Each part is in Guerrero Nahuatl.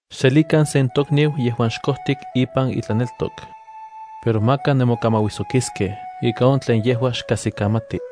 Xselikan sen tokniu yejuan xkojtik ipan itlaneltok. Pero maka nemokamauijsokiskej ika on tlen yejua xkajsikamati.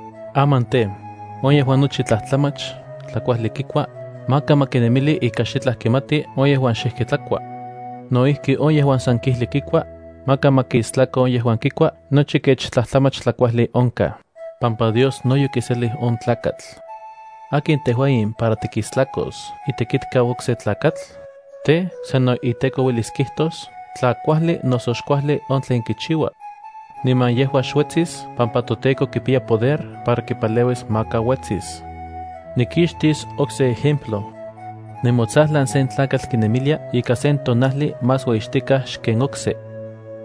Aman tej, on yejuan nochi tlajtlamach tlakuajli kikua, maka ma kinemili ika xitlaj kimati on yejuan xijki tlakua. No ijki on yejuan san kijli kikua, maka ma kistlako on yejuan kikua nochi kech tlajtlamach tlakuajli onkaj, pampa Dios no yokiselij on tlakatl. ¿Akin tejua in para tikistlakos itekitkau okse tlakatl? Tej, san on iteko uelis kijtos tla kuajli noso xkuajli on tlen kichiua. Niman yejua xuetsis pampa toTEKO kipiya poder para kipaleuis maka uetsis. Nikixtis okse ejemplo. Nemotsajlan sen tlakatl kinemilia ika sen tonajli más ueyixtikaj xken okse.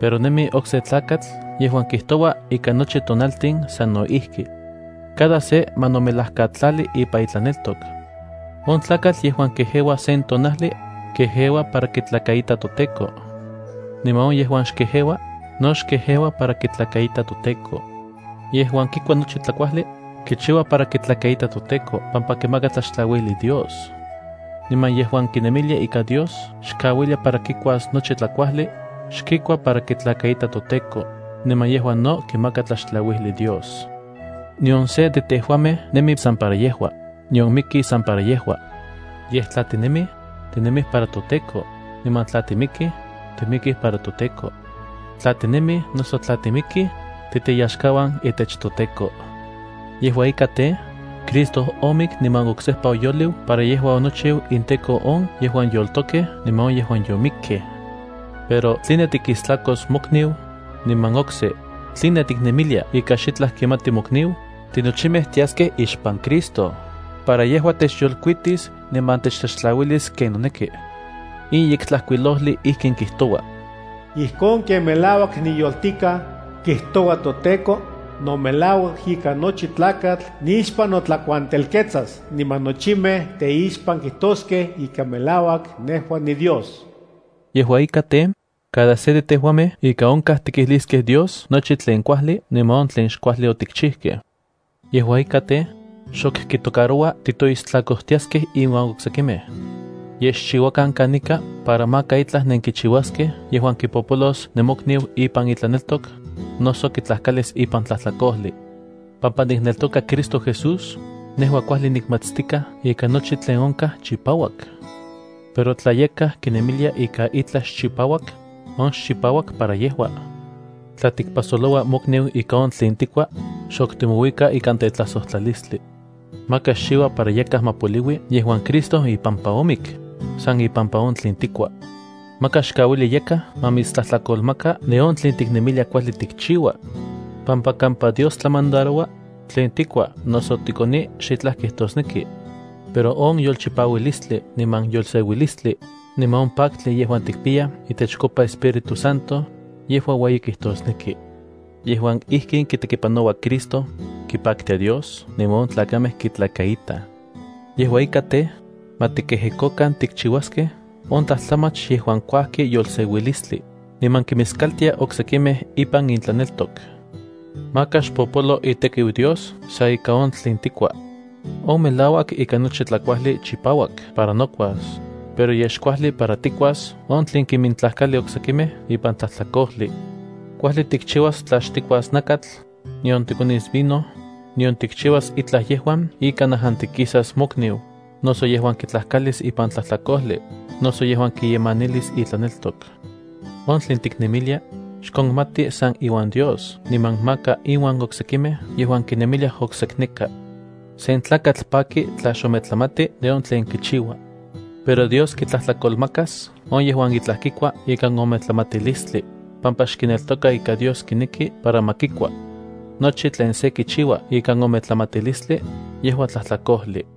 Pero nemi okse tlakatl yejuan kijtoua ika nochi tonaltin sano ijki. Cada se ma nomelajkatlali ipan itlaneltok. On tlakatl yejuan kejeua sen tonajli, kejeua para kitlakaita toTEKO. Niman on yejuan xkejeua, no xkejeua para kitlakaita toTEKO. Yejuan kikua nochi tlajkuajli, kichiua para kitlakaita toTEKO pampa kimaka tlaxtlauijli Dios. Niman yejuan kinemilia ika Dios xkauilia para kikuas nochi tlakuajli, xkikua para kitlakaita toTEKO, niman yejua no kimaka tlaxtlauijlij Dios. Nion se de tejuamej nemi san para yejua, nion miki san para yejua. Yej tla tinemij, tinemij para toTEKO, niman tla timikij, timikij para toTEKO. Tla tinemij noso tla timikij, titeyaxkauan itech toTEKO. Yejua ika tej, Cristo omik niman oksejpa oyoliu para yejua onochiu inTEKO on yejuan yoltokej niman on yejuan yomikkej. Pero ¿tline tikistlakos mokniu? Niman okse, ¿tline tiknemilia ika xitlaj kimati mokniu? Tinochimej tiaskej ixpan Cristo para yejua techyolkuitis niman techtlaxtlauilis ken noneki. In Yektlajkuilojli ijkin kijtoua: “Ijkon ken melauak niyoltikaj, kijtoua toTEKO, no melauak ika nochi tlakatl nixpan notlakuantelketsas niman nochimej teixpan kijtoskej ika melauak nejua niDios.” Yejua ika tej, cada se de tejuamej ika onkaj tikijliskej Dios nochi tlen kuajli niman on tlen xkuajli otikchijkej. Yejua ika tej, xok kitocaroua titoistlakojtiaskej iuan oksekimej. Yej xchiuakan kanika para maka itlaj nenkichiuaskej yejuan kipopolos nemokniu ipan itlaneltok, noso kitlajkalis ipan tlajtlakojli. Pampa nikneltoka Cristo Jesús, nejua kuajli nikmatstikaj ika nochi tlen onkaj chipauak. Pero tla yakaj kinemilia ika itlaj xchipauak, on xchipauak para yejua. Tla tikpajsoloua mokniu ikan on tlen tikua, xok timouika ikan tetlajsojtlalistli. Maka xchiua para yakaj ma poliui yejuan Cristo ipampa omik, san ipampa on tlen tikua. Maka xkauili yakaj ma mitstlajtlakolmaka de on tlin tiknemilia kuajli tikchiua, pampa kampa Dios tlamandaroua, tlen tikua noso tikoni xitlaj kijtosneki. Pero on yolchipaualistli niman yolseuilistli, niman on paktli yejuan tikpiyaj itechkopa Espíritu Santo, yejua ueyi kijtosneki. Yejuan ijkin kitekipanoua Cristo, kipaktia Dios niman on tlakamej kitlakaitaj. Yejua ika tej, ma tikejekokan tikchiuaskej on tlajtlamach yejuan kuajkij yolseuilistli, niman kimiskaltiaj oksekimej impan intlaneltok. Maka xpopolo itekiu Dios san ika on tlen tikua. On melauak ika nochi tlakuajli chipauak para nokuas, pero yej xkuajli para tikuas on tlen kimintlajkali oksekimej ipan tlajtlakojli. Kuajli tikchiuas tla xtikuas nakatl, nion tikonis vino, nion tikchiuas itlaj yejuan ika najantikisas mokniu, noso yejuan kitlajkalis ipan tlajtlakojli, noso yejuan kiyemanilis itlaneltok. On tlen tiknemilia, xkonmati san iuan Dios niman maka inuan oksekimej yejuan kinemiliaj oksekneka. Sen tlakatl paki tla xometlamati de on tlen kichiua. Pero Dios kitlajtlakolmakas on yejuan itlaj kikua ikan ometlamatilistli, pampa xkineltoka ika Dios kineki para ma kikua. Nochi tlen se kichiua ikan ometlamatilistli, yejua tlajtlakojli.